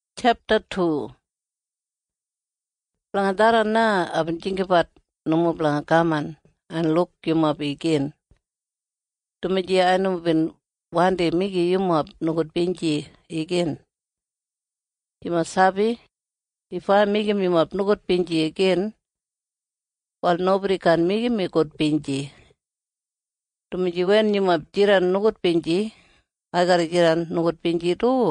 En blanga tharran na aibin jinggabat nomo blanga kaman en luk yumob igin, dumaji ai nomo bin wandi meigim yumob nogudbinji igin. Yumob sabi? If ai meigim yumob nogudbinji igin, wal nobodi kaan meigim mi gudbinji, dumaji wen yumob jidan nogudbinji, ai garra jidan nogudbinji du.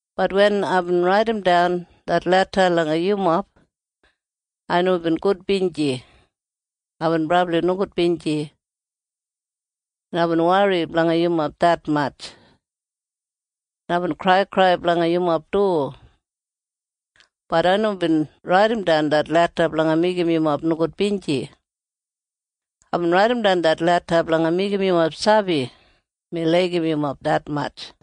Bat wen aibin raidimdan det leda langa yumob, ai nomo bin gudbinji. Aibin brabli nogudbinji, en aibin wori blanga yumob detmatj, en aibin kraikrai blanga yumob du. Bat ai nomo bin raidimdan det leda blanga meigim yumob nogudbinji. Aibin raidimdan det leda blanga meigim yumob sabi mi laigim yumob detmatj.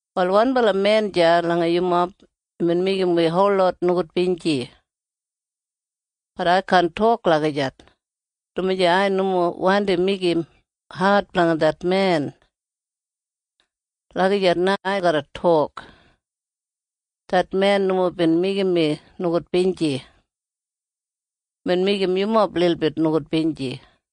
Wal wanbala men deya langa yumob imbin meigim wi holot nogudbinji. Bat ai kaan tok lagijat, dumaji ai nomo wandi meigim ad blanga det men. Lagijat na ai garra tok. Det men nomo bin meigim mi nogudbinji. Imbin meigim yumob lilbit nogudbinji.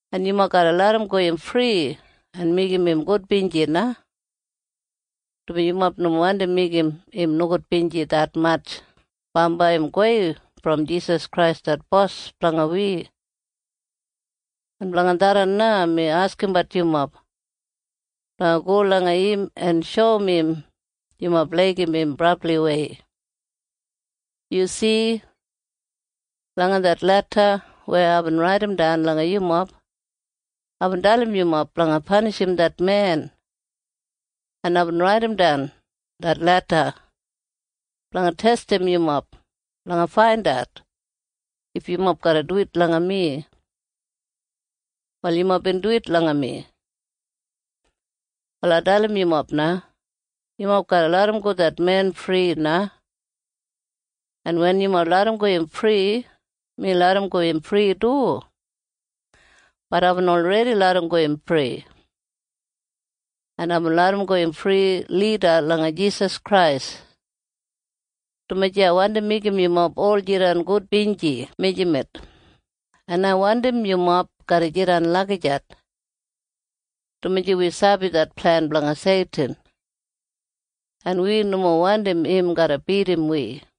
En yumob garra larramgo im fri en meigim im gudbinji na, dumaji yumob nomo wandi meigim im nogudbinji detmatj bambai im gowei brom Jisas Krais det Bos blanga wi. En blanga tharran na mi askimbat yumob blanga go langa im en shoum im yumob laigim im brabliwei. Yu si? Langa det leda weya aibin raidimdan langa yumob, aibin dalim yumob blanga panishim det men. En aibin raidimdan det leda blanga testim yumob blanga faindat if yumob garra duwit langa mi. En yumob bin duwit langa mi. Wal ai dalim yumob na. Yumob garra larramgo det men fri na. En wen yumob larramgo im fri, mi larramgo im fri du. Bat aibin olredi larramgo im fri. En aibin larramgo im fri lida langa Jisas Krais, dumaji ai wandi meigim yumob ol jidan gudbinji mijamet. En ai wandim yumob garra jidan lagijat, dumaji wi sabi det plen blanga Seitin, en wi nomo wandim im garra bidim wi.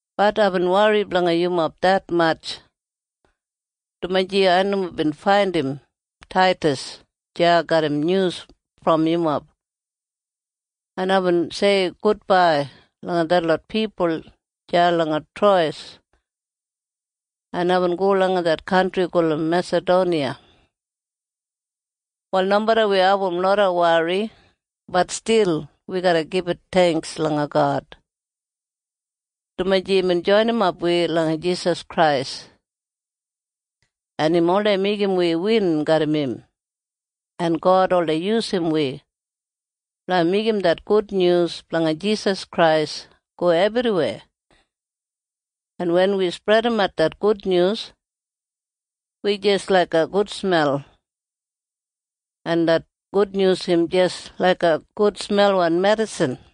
Bat aibin wori blanga yumob detmatj, dumaji ai nomo bin faindim Taidas deya garram nyus brom yumob. En aibin sei gudbai langa detlot pipul deya langa Trowes, en aibin go langa det kantri gulum Mesadoniya. Wal nomeda wi abum loda wori, bat stil wi garra gibit theingks langa God, dumaji imbin joinimap wi langa Jisas Krais, en im oldei meigim wi win garram im, en God oldei yusum wi blanga meigim det gudnyus blanga Jisas Krais go ebriweya, en wen wi spredimat det gudnyus, wi jis laiga gudsmel, en det gudnyus im jis laiga gudsmelwan medisin.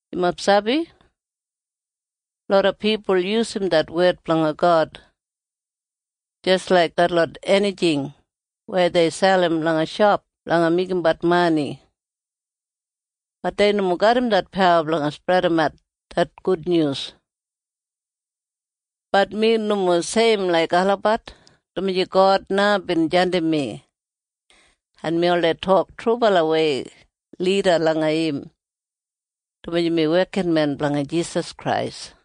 Yumob sabi? Loda pipul yusum det wed blanga God jis laik detlot enijing weya dei selim langa shop blanga meigimbat mani. Bat dei nomo garram det pawa blanga spredimat det gudnyus. Bat mi nomo seim laik olabat, dumaji God na bin jandim mi. En mi oldei tok trubalawei lida langa im, dumaji mi wekinmen blanga Jisas Krais.